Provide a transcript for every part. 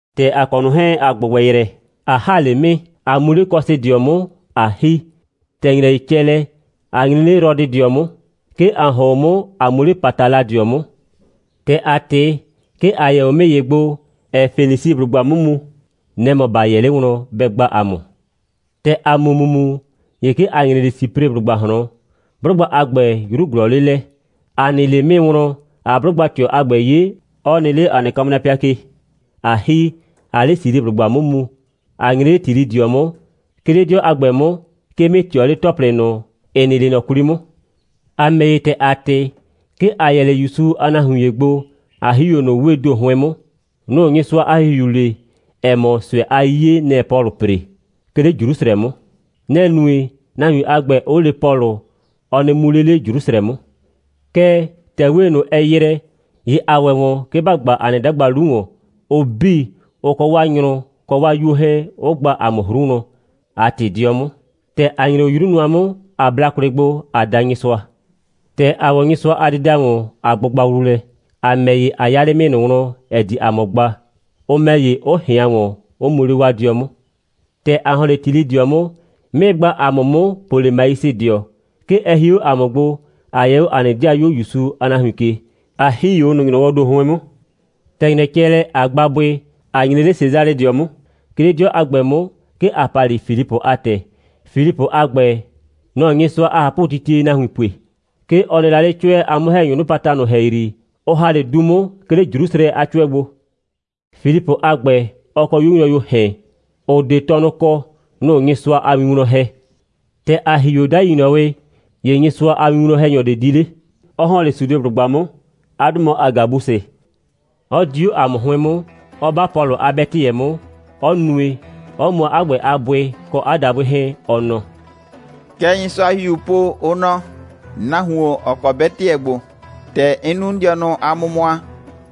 ‑Tɛ ‑a kɔ ꞊nʋ 'hɛɛn, ‑a ‑gbʋgbɛ yrɛ, ꞊a ‑ha 'le 'mɩɩ, ꞊a mu 'le Kɔsɩdɩɔ 'mʋ, ꞊a ‑hi. ‑Tɛ ‑nyrɛ ‑ye cɛ lɛ, ‑a nyre 'le Rɔdɩdɩɔ 'mʋ. 'Ke ‑a ‑hɔn 'o 'mʋ, ꞊a mu 'le Pataladɩɔ 'mʋ. ‑Tɛ ‑a ꞊tɩ, 'ke ‑a yɛ 'o 'mɩɩ ‑ye gbo, ‑ɛɛ Fenisiblʋgba 'mʋ mu. Nɛ‑ mɔ ‑ba 'yɛ 'le wlɔn, bɛ gba ‑a mʋ. ‑Tɛ ‑a mu ‑mumu, ‑ye 'ke ‑a nyre 'le Sipreblʋgba ꞊hlɔn. 'Blʋgba a ‑gbɛ, 'yru ꞊glɔɔ 'le lɛ. ‑A nɩ 'le 'mɩɩ wlɔn, ꞊aa 'blʋgba꞊tɩɔ a ‑gbɛ 'ye, 'ɔ nɩ 'le ‑a nɩ kamrapɩa ke, ꞊a ‑hi, ꞊aa 'le Siliblʋgba 'mʋ mu, ꞊a nyre 'le Tilɩdɩɔ 'mʋ. 'Ke 'le 'dɩɔ a ‑gbɛ 'mʋ, 'ke 'mɩɩ ꞊tɩɔ 'le ‑tɔplɩ ꞊nʋ, ‑ɩ nɩ 'le ꞊nɔ 'kwli 'mʋ. ‑A ‑mɛ ‑ye, ‑tɛ ‑a ꞊tɩ, 'ke ‑a yɛ 'le ‑Yusu a nahuin ‑ye gbo, ꞊a ‑hi 'o ꞊nʋ 'wee ‑do 'hʋɩn 'mʋ. Nʋ‑ Nyɩsʋa a ‑Hihiu le, ‑ɛ mɔ, ꞊sʋɛ a 'yiye, nɛ‑ɛ Pɔlʋ ‑pre, 'ke 'le Jrusrɛ 'mʋ. Nɛ‑ nue, nahuin a ‑gbɛ, 'ʋ le Pɔlʋ, ɔ nɩ mu 'le 'le Jrusrɛ 'mʋ. Kɛɛ, ‑tɛ 'wee ꞊nʋ, ɛ ‑yrɛ, ‑ye ‑a ‑wɛ ‑wɔn, 'ke ‑ba gba ‑a nɩ 'dagba 'lu ‑wɔn, ʋ 'bii, ʋ kɔ 'waa nyrʋ kɔ 'waa 'yuo 'hɛɛn, 'ʋ gba ‑a mʋ 'hru wlɔn, ꞊a ꞊tɩ 'dɩɔ 'mʋ. ‑Tɛ ‑a nyre 'o 'yru nʋa 'mʋ, ꞊a bla kwlɩ gbo, ꞊a da Nyɩsʋa. ‑Tɛ ‑a ‑wɔ Nyɩsʋa a dɩda ‑wɔn, ꞊a gbʋgba wlu lɛ. ‑A ‑mɛ ‑ye, ‑a 'ya 'le 'mɩɩ ꞊nʋ wlɔn, ‑ɛ di ‑a mʋ gba, ʋ ‑mɛ ‑ye, 'ʋ ꞊hɩan ‑wɔn, 'ʋ mu 'le 'waa 'dɩɔ 'mʋ. ‑Tɛ ‑a ‑hɔn 'le Tilɩdɩɔ 'mʋ, 'mɩɩ gba ‑a mʋ 'mʋ Polemaisɩdɩɔ. 'Ke ɛ hie 'o ‑a mʋ gbo, ꞊a yɛ ‑a nɩ 'dɩayuo ‑Yusu a nahuin ke, ꞊a ‑hi 'o ꞊nʋ ‑nyrɔwɔɔ ‑do 'hʋɩn 'mʋ. ‑Tɛ ‑nyrɛ cɛ lɛ, ꞊a gba bʋɩ, ꞊a nyre 'le Sesalɩdɩɔ 'mʋ. 'Ke 'le 'dɩɔ a ‑gbɛ 'mʋ, 'ke ‑a pa 'le Filipʋ a ‑tɛ. Filipʋ a ‑gbɛ, nɔ‑ɔ Nyɩsʋa a ꞊hapʋtitie nahuin pue. 'Ke ɔ nɩ la 'le 'cʋɛ a 'mʋ‑hɛnyʋʋ 'nɩpata ꞊nʋ ‑hɛyri, ʋ ‑ha 'le du 'mʋ, 'ke 'le Jrusrɛ a 'cʋɛ gbo. Filipʋ a ‑gbɛ, ɔ kɔ 'yuo nyrʋyuoo ‑hɛn, ‑ʋ 'de tɔnʋ kɔ. Nʋ‑ʋ Nyɩsʋa a win wlɔn ‑hɛ. ‑Tɛ ‑a ‑hi 'o 'dai ‑nyrɔwɩ, ‑ye Nyɩsʋa a winwlɔn‑hɛnyɔ ꞊de di 'le, 'ɔ ‑hɔn 'le Sudeblʋgba 'mʋ. 'A 'dʋ mɔ Agabusɩ; 'ɔ di 'o ‑a mʋ 'hʋɩn 'mʋ, 'ɔ 'ba Pɔlʋ a 'bɛtɩyɛ 'mʋ, 'ɔ nue, 'ɔ mʋa 'a ‑gbɛ a bʋɩ kɔ 'a dabʋɩ 'hɛɛn, ɔ nɔ: «Kɛ Nyɩsʋa a ‑Hihiuu po, ʋ nɔ: Nahuon, ‑ɔ kɔ 'bɛtɩyɛ ‑gbo, ‑tɛ 'n nu 'n dɩɔnʋ a mʋmʋa,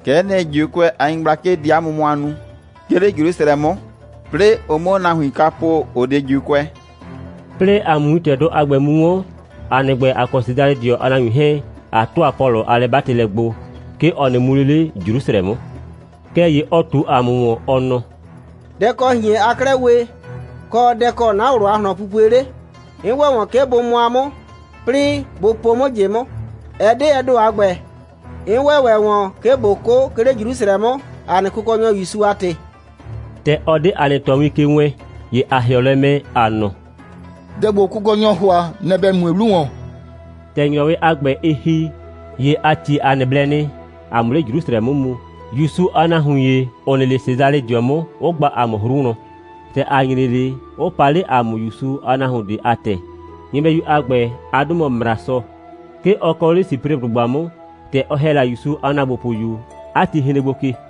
kɛ'ɛ nɩ, ‑Juukʋɛ a nyɩgblakɩ di 'a mʋmʋa nu, 'ke 'le Jrusrɛ 'mʋ, 'plɩɩ ʋ 'muo nahuin ꞊nʋ kwa po, ‑ʋ 'de ‑Juukʋɛ.» 'Plɩɩ ‑a 'mʋ wintɛdʋ a ‑gbɛ mu 'wɔn, ‑a nɩ ‑gbɛ, ‑a kɔ Sesalɩdɩɔ a nahuin 'hɛɛn, ‑a ‑tʋa Pɔlʋ a lɛ'batɩlɛ gbo, 'ke ɔ nɩ mu 'le 'le Jrusrɛ 'mʋ. Kɛɛ ‑ye ɔ ꞊tu ‑a mʋ ‑wɔn, ɔ nɔ: «Dɛ‑ kɔ ꞊hien aa 'klɛɛ we, kɔ, dɛ‑ kɔ 'na ꞊wlʋ a ꞊hlɔnpupue 'le? 'N ‑wɛ ‑wɔn, 'ke bʋ mʋa 'mʋ, 'plɩɩ bʋ po 'mʋ ꞊jɩ 'mʋ. Ɛ 'de ɛ ‑do a ‑gbɛ. 'N ‑wɛ ‑wɛ ‑wɔn, 'ke ꞊bo 'kʋ, 'ke 'le Jrusrɛ 'mʋ, ‑a nɩ Kʋkɔnyɔ ‑Yusu a ‑tɩ.» ‑Tɛ ɔ 'de ‑a nɩ ꞊tɔwin ke wɛɛn, ‑ye ‑a ‑hɩɔ lɛ mɛ, ‑a nɔ: «Dɛ ‑gbo Kʋkɔnyɔɔ ‑hʋa, nɛ‑ ‑bɛ mue 'lu ‑wɔn.» ‑Tɛ ‑nyrɔwɩ a ‑gbɛ, ɩ ‑hi, ‑ye ‑a ‑tie ‑a nɩ blɛ nɩ, ‑a 'mʋ 'le Jrusrɛ 'mʋ mu, ‑Yusu a nahuin ‑ye, ‑ʋ nɩ 'le Sesalɩdɩɔ 'mʋ, 'ʋ gba ‑a mʋ 'hru wlɔn. ‑Tɛ ‑a nyre 'le, 'ʋ paa 'le ‑a mʋ ‑Yusu a nahuon ꞊de a ‑tɛ. Nyɩbɛyu a ‑gbɛ, 'a 'dʋ mɔ Mrasɔ. 'Ke ɔ kɔ 'le Sipreblʋgba 'mʋ. ‑Tɛ ɔ ‑hɛ la ‑Yusu a ‑naagbopʋyu, 'a ti hren gbo ke.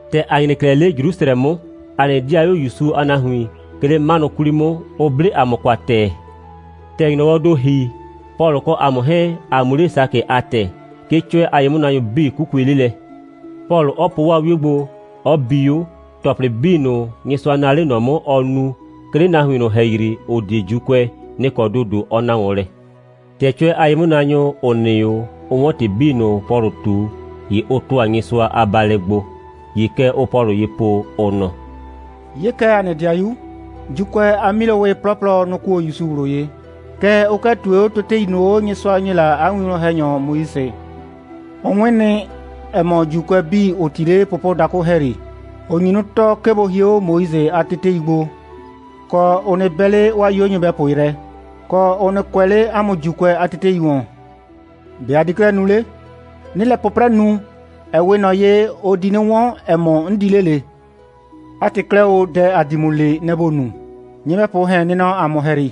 ‑Tɛ ‑a nyre 'klɛɛ 'le Jrusrɛ 'mʋ, ‑a nɩ 'dɩayuo ‑Yusu a nahuin, 'ke 'le 'manʋ 'kwli 'mʋ, ʋ 'ble ‑a mʋ kwa ‑tɛɛ. ‑Tɛ ‑nyrɔwɔɔ ‑do ‑hi, Pɔlʋ kɔ ‑a mʋ 'hɛɛn, ‑a mu 'le Sakɩ a ‑tɛ. 'Ke 'cʋɛ a ye'mʋnaanyʋ 'bii 'kukue 'le lɛ; Pɔlʋ 'ɔ po 'waa 'wio gbo, 'ɔ bi 'o, ‑tɔplɩ 'bii ꞊nʋ, Nyɩsʋa naa 'le ꞊nɔ 'mʋ, ɔ nu, 'ke 'le nahuin ꞊nʋ ‑hɛyri, ‑ʋ 'de ‑Juukʋɛ, nɩ‑ kɔ ‑dodo ɔ na ‑wɔn lɛ. ‑Tɛ 'cʋɛ a ye'mʋnaanyʋ, ‑ʋ nɩ 'o, ʋ 'wɔn ‑tɩ 'bii ꞊nʋ, Pɔlʋ ꞊tu, ‑ye ʋ ‑tʋa Nyɩsʋa a baalɛ gbo. ‑Ye kɛ ʋʋ Pɔlʋ ye po, ʋ nɔ: «'Ye kɛ, ‑a nɩ 'dɩayu, ‑Juukʋɛ a 'milowɩ 'plɔplɔ, nʋ‑ kuo ‑Yusu ꞊wlʋ ye, kɛɛ, ʋ 'kɩɛ ꞊tue 'o tetei ꞊nʋ 'o, Nyɩsʋa ‑nyi la 'a winwlɔn‑hɛnyɔ Moise. Ʋ 'wɩn nɩ, ‑ɛ mɔ, ‑Juukʋɛ 'bii, ‑ʋ 'ti 'le pʋpʋdakʋ ‑hɛyri, ‑n nyu 'nɩ tɔɔ, 'ke bʋ hie 'o Moise a tetei gbo, kɔ, ʋ nɩ 'bɛ 'le 'waa 'yuo nyɩbɛpʋ yrɛ, kɔ, ʋ nɩ kʋɛ 'le ‑a mʋ ‑Juukʋɛ a tetei ‑wɔn. ‑Be' ‑a di 'klɛɛ nu 'le? 'Nɩɩ lɛ 'pʋprɛ nu, ‑ɛ 'we ꞊nɔ ye, ʋ di 'nɩ 'wɔn, ‑ɛ mɔ, ‑n di 'le ꞊le. 'A ‑tɩ 'klɛɛ o, dɛ, ‑a di ‑mʋ le, nɛ‑ ‑bo nu. Nyɩbɛpʋʋ ‑hɛn nɩ nɔ ‑a mʋ ‑hɛyri.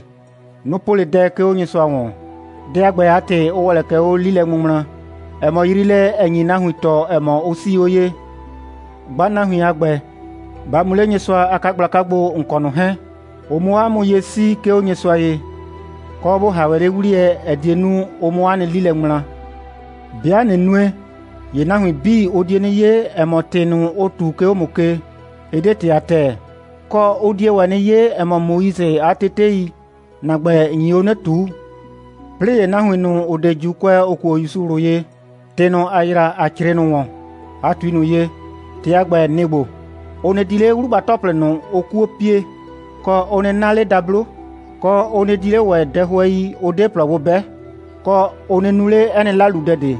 Nʋ‑ po 'le dɛ, 'ke 'o Nyɩsʋa ‑wɔn. Dɛ a ‑gbɛ a ‑tɩ, ʋ ‑wɛ lɛ kɛ 'o 'lilɛŋmʋŋmla, ‑ɛ mɔ yriilɛ, ‑ɛ nyi nahuin tɔɔ, ‑ɛ mɔ, ʋ 'sii 'o ye. Gba nahuin a ‑gbɛ, ba mu 'le Nyɩsʋa a 'kagblaka gbo, ‑n kɔ ꞊nʋ 'hɛɛn, ʋ 'mʋ 'o 'a mʋ ye 'sii, 'ke 'o Nyɩsʋa ye, kɔ, ‑bo ‑ha ‑wɛ 'le 'wliyɛ, ‑ɛ die nu, ʋ 'mʋ 'a nɩ 'li lɛ ŋmla. 'Bɩa ꞊nɩ nue, ‑ye nahuin 'bii, ʋ die 'nɩ 'ye, ‑ɛ mɔ, ‑tɩ ꞊nʋ, ʋ ꞊tu, 'ke 'o ‑mʋ ke, ɩ 'de ‑tɩ a ‑tɛɛ. Kɔ, ʋ die ‑wɛ 'nɩ 'ye, ‑ɛ mɔ, Moise a tetei, ‑na ‑gbɛ, ‑n nyi 'o 'nɩ ꞊tuu. 'Plɩɩ ‑ye nahuin ꞊nʋ, ‑ʋ 'de ‑Juukʋɛ, ‑ʋ kuo ‑Yusu ꞊wlʋ ye, ‑tɩ ꞊nʋ, ‑a ‑yra, ‑a 'crɩɩ ꞊nʋ ‑wɔn, ꞊a ꞊tui ꞊nʋ ye. ‑Tɩ a ‑gbɛ, nɩ‑ ‑gbo: Ʋ nɩ di 'le 'wlugba‑tɔplɩ ꞊nʋ, ʋʋ 'kuo pie, kɔ, ʋ nɩ 'na 'le dablo, kɔ, ʋ nɩ di 'le ‑wɛ dɛhʋɛi, ʋ 'de ‑plɔ gbo 'bɛ, kɔ, ʋ nɩ nu 'le 'ɛ nɩ 'laludɛ ꞊de.»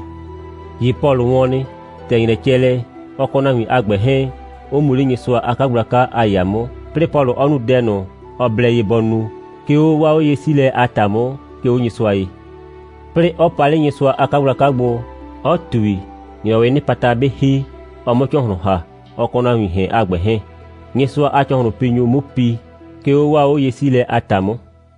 ‑Ye Pɔlʋ wɔn nɩ. ‑Tɛ ‑nyrɛ cɛ lɛ, ɔ kɔ nahuiin ‑hɛn a ‑gbɛ 'hɛɛn, 'ʋ mu 'le Nyɩsʋa a 'kagblaka a ‑yaa 'mʋ, 'plɩɩ Pɔlʋ 'ɔ nu dɛ ꞊nʋ, ɔ blɛ ye bɔ nu, 'ke 'o 'waa 'oye'siilɛ a ‑ta 'mʋ, 'ke 'o Nyɩsʋa ye, 'plɩɩ 'ɔ pa 'le Nyɩsʋa a 'kagblaka gbo, 'ɔ ꞊tui, ‑nyrɔwɩɩ 'nɩpata 'bɩ ‑hi, ɔ 'mʋ ‑cɔhlʋn ‑ha, ɔ kɔ nahuiin ‑hɛn a ‑gbɛ 'hɛɛn, Nyɩsʋa a ‑cɔhlʋnpinyʋ 'mu pi, 'ke 'o 'waa 'oye'siilɛ a ‑ta 'mʋ.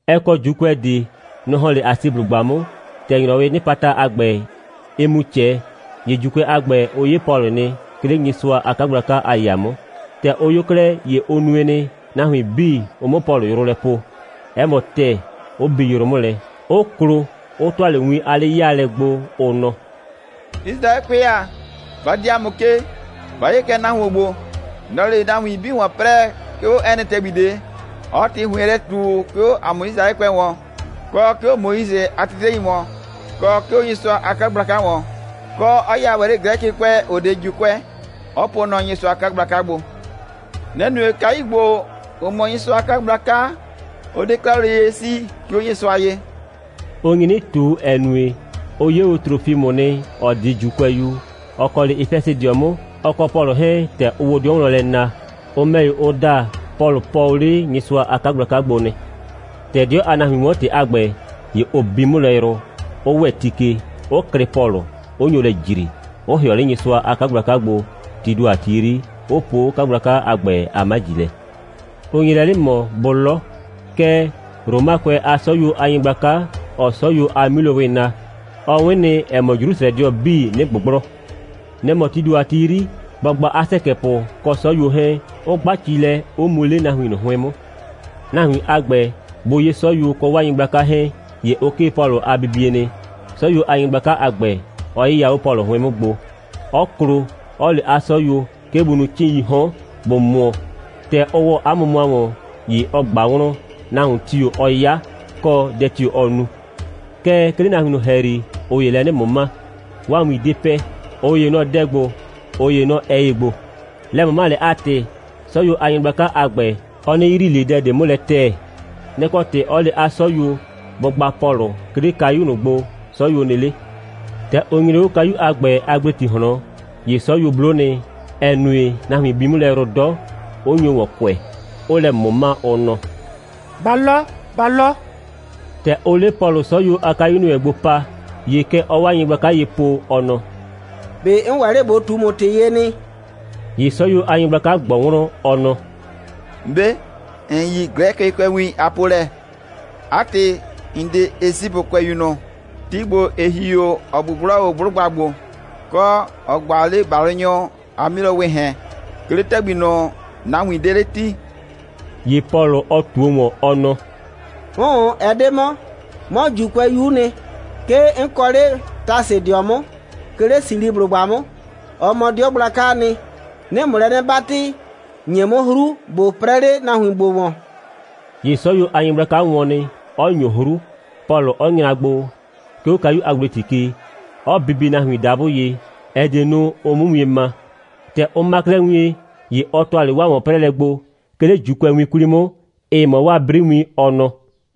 Ɛ kɔ ‑Juukʋɛ ꞊de. Nʋ‑ ‑hɔn 'le Asiblʋgba 'mʋ. ‑Tɛ ‑nyrɔwɩɩ 'nɩpata a ‑gbɛ, ɩɩ mu ꞊cɛ, ‑ye ‑Juukʋɛ a ‑gbɛ, ʋ 'ye Pɔlʋ nɩ, 'ke 'le Nyɩsʋa a 'kagblaka a ‑yaa 'mʋ. ‑Tɛ ʋ 'yo 'klɛɛ, ‑ye ʋ nue nɩ, nahuin 'bii, ʋ 'mʋ Pɔlʋ yrʋ lɛ poo. 'Ɛ mɔ ‑tɛɛ, 'ʋ bi yrʋ 'mʋ lɛ, 'ʋ klo, 'ʋ ‑tʋa 'le win a 'le'yaalɛ gbo, ʋ nɔ: «Yisraɛkʋɛ ‑a, ba dii ‑a mʋ ke! Ba 'ye kɛ nahuon ‑gbo. Nɔ‑ɔ 'le nahuin 'bii ‑wɔn 'prɛɛ, 'ke 'o 'ɛ nɩ ‑tɛgbi ꞊de, 'ɔɔ ‑tɩ ‑hʋɩn lɛ ꞊tu, 'ke 'o ‑a mʋ Yisraɛkʋɛ ‑wɔn, kɔ 'ke 'o Moise a tetei ‑wɔn, kɔ 'ke 'o Nyɩsʋa a 'kagblaka ‑wɔn, kɔ, 'ɔ ya ‑wɛ 'le Glɛkɩkʋɛ, ‑ʋ 'de ‑Juukʋɛ, 'ɔ pʋʋ nɔ Nyɩsʋa a 'kagblaka gbo. Nɛ‑ nue, kayu ‑gbo, ‑ʋ mɔ Nyɩsʋa a 'kagblaka, 'ʋ 'de 'klɛɛ 'o lele ye 'sii, 'ke 'o Nyɩsʋa ye.» Ʋ nyi 'nɩ ꞊tu, ‑ɛ nue, ʋ 'ye o Trofimʋ nɩ, ‑ɔ 'de ‑Juukʋɛyu, ‑ɔ kɔ 'le Efɛsɩdɩɔ 'mʋ, ɔ kɔ Pɔlʋ 'hɛɛn, ‑tɛ ʋʋ o 'dɩɔ wlɔn lɛ na. Ʋ ‑mɛ ‑ye, ʋ da, Pɔlʋ pɔɔ o 'le Nyɩsʋa a 'kagblaka gbo nɩ. ‑Tɛ 'dɩɔ a nahuin 'wɔn ‑tɩ a ‑gbɛ, ‑ye ʋ bi 'mʋ lɛ yrʋ, 'ʋ ‑wɛ ti ke, 'ʋ klɩ Pɔlʋ, 'ʋ nyo lɛ ‑jri, 'ʋ ‑hɩɔ 'le Nyɩsʋa a 'kagblaka gbo, tii ‑do a ti 'yri, 'ʋ po 'o 'kagblaka a ‑gbɛ a 'maji lɛ. Ʋ nye lɛ 'nɩ ꞊mɔ, bʋ 'lɔ. Kɛɛ, Romakʋɛ a 'sɔyuo a nyɩgblaka, ‑ɔɔ 'sɔyuo a 'milowɔ naa, ɔ 'wɩn nɩ, ‑ɛ mɔ, Jrusrɛdɩɔ 'bii 'nɩ ꞊gbʋgblɔ. Nɛ‑ mɔ, tii ‑do a ti 'yri, bɔ gba 'a ‑sɛkɛpʋ kɔ 'sɔyuo 'hɛɛn, 'ʋ 'gba ci lɛ, 'ʋ mu 'le nahuin ꞊nʋ 'hʋɩn 'mʋ. Nahuin a ‑gbɛ bʋ 'ye 'sɔyuo kɔ 'waa nyɩgblaka 'hɛɛn, ‑ye ʋ 'kee Pɔlʋ a bibie nɩ, 'sɔyuo a nyɩgblaka a ‑gbɛ, 'ɔ 'yɩya 'o Pɔlʋ 'hʋɩn 'mʋ gbo, 'ɔ klo, 'ɔ le 'a 'sɔyuo, 'ke bʋ nu 'cɩɩn.ii 'hɔn, bʋ mʋɔ. ‑Tɛ ʋ ‑wɔ 'a mʋmʋa ‑wɔn, ‑ye ɔ ꞊gba wlɔn, nahuon tio‑ ɔ 'ya, kɔ, dɛ tio‑ ɔ nu. Kɛɛ, 'ke 'le nahuin ꞊nʋ ‑hɛyri, ꞊ʋ ‑yee lɛ 'nɩ ꞊mʋma. 'Waa win 'de pɛ. ꞊Ʋ ‑ye nɔ dɛ ‑gbo, ꞊ʋ ‑ye nɔ ꞊ɛ ‑ye ‑gbo. Lɛ꞊mʋmalɛ a ‑tɩ, 'sɔyuo a nyɩgblaka a ‑gbɛ, ɔ 'nɩ yrii ꞊le dɛ ꞊de 'mʋ lɛ ‑tɛɛ. Nɛ‑ kɔ ‑tɩ 'ɔ le 'a 'sɔyuo, bʋ gba Pɔlʋ 'ke 'le kayu ꞊nʋ gbo, 'sɔyuo nɩ 'le. ‑Tɛ ʋ nyre 'o kayu a ‑gbɛ a ‑gbleti ꞊hlɔn, ‑ye 'sɔyuo 'blo nɩ, ‑ɛ nue, nahuin bi 'mʋ lɛ yrʋ 'dɔ, 'ʋ nyo ‑wɔn kʋɛ, 'ʋʋ lɛ ꞊mʋma, ʋ nɔ: «Ba 'lɔ, ba 'lɔ!» ‑Tɛ ʋʋ 'le Pɔlʋ 'sɔyuo a kayu ‑nɩ wɛn gbo mu paa, ‑ye kɛ ɔɔ 'waa nyɩgblaka ye po, ɔ nɔ: «꞊Be 'n ‑wɛ 'le ꞊bo ꞊tu ‑mʋ ‑tɩ ye nɩ?» ‑Ye 'sɔyuo a nyɩgblaka ꞊gbɔ wlɔn, ɔ nɔ: «‑Mbe', ‑n yi Glɛkɩkʋɛwin a polɛ? 'A ‑tɩ, ‑n 'de Esipʋkʋɛyu ꞊nʋ, ti ‑gbo, ‑ɩ ‑hi o, ‑ɔ ꞊gbʋgblɔ o 'blʋgba ‑gbo, kɔ, ‑ɔ gba o 'le ‑balʋnyʋ a 'milowɩɩ ‑hɛn, 'ke 'le ‑tɛgbi ꞊nʋ, nahuin ꞊de 'de 'le 'ti?» ‑Ye Pɔlʋ, ɔ ꞊tuo ‑wɔn, ɔ nɔ: «'Ʋʋn, ɛ 'de 'mɔ. 'Mɔ ‑Juukʋɛyu'u nɩ. 'Ke 'n kɔ 'le Tasɩdɩɔ 'mʋ, 'ke 'le Silisiblʋgba 'mʋ. Ɔ mɔ 'dɩɔ gblakaa nɩ. 'Nɩɩ ‑mʋ lɛ 'nɩ 'batɩ, ‑nye 'mʋ 'hru, ꞊bo 'prɛɛ 'le nahuin ‑gbo ‑wɔn.» ‑Ye 'sɔyuo a nyɩgblaka wɔn nɩ, 'ɔ ‑nyo 'hru, Pɔlʋ 'ɔ nyra gbo, 'ke 'o kayu a ‑gbleti ke, 'ɔ bibie nahuin dabʋ ye, ‑ɛ die nu, ʋ 'mʋ wien ma. ‑Tɛ ʋ ma 'klɛɛ wien, ‑ye ɔ ‑tʋa 'le 'waa ‑wɔn'prɛɛlɛ gbo, 'ke 'le ‑Juukʋɛwin 'kwli 'mʋ, ‑ɩ mɔ 'waa 'briwin, ɔ nɔ: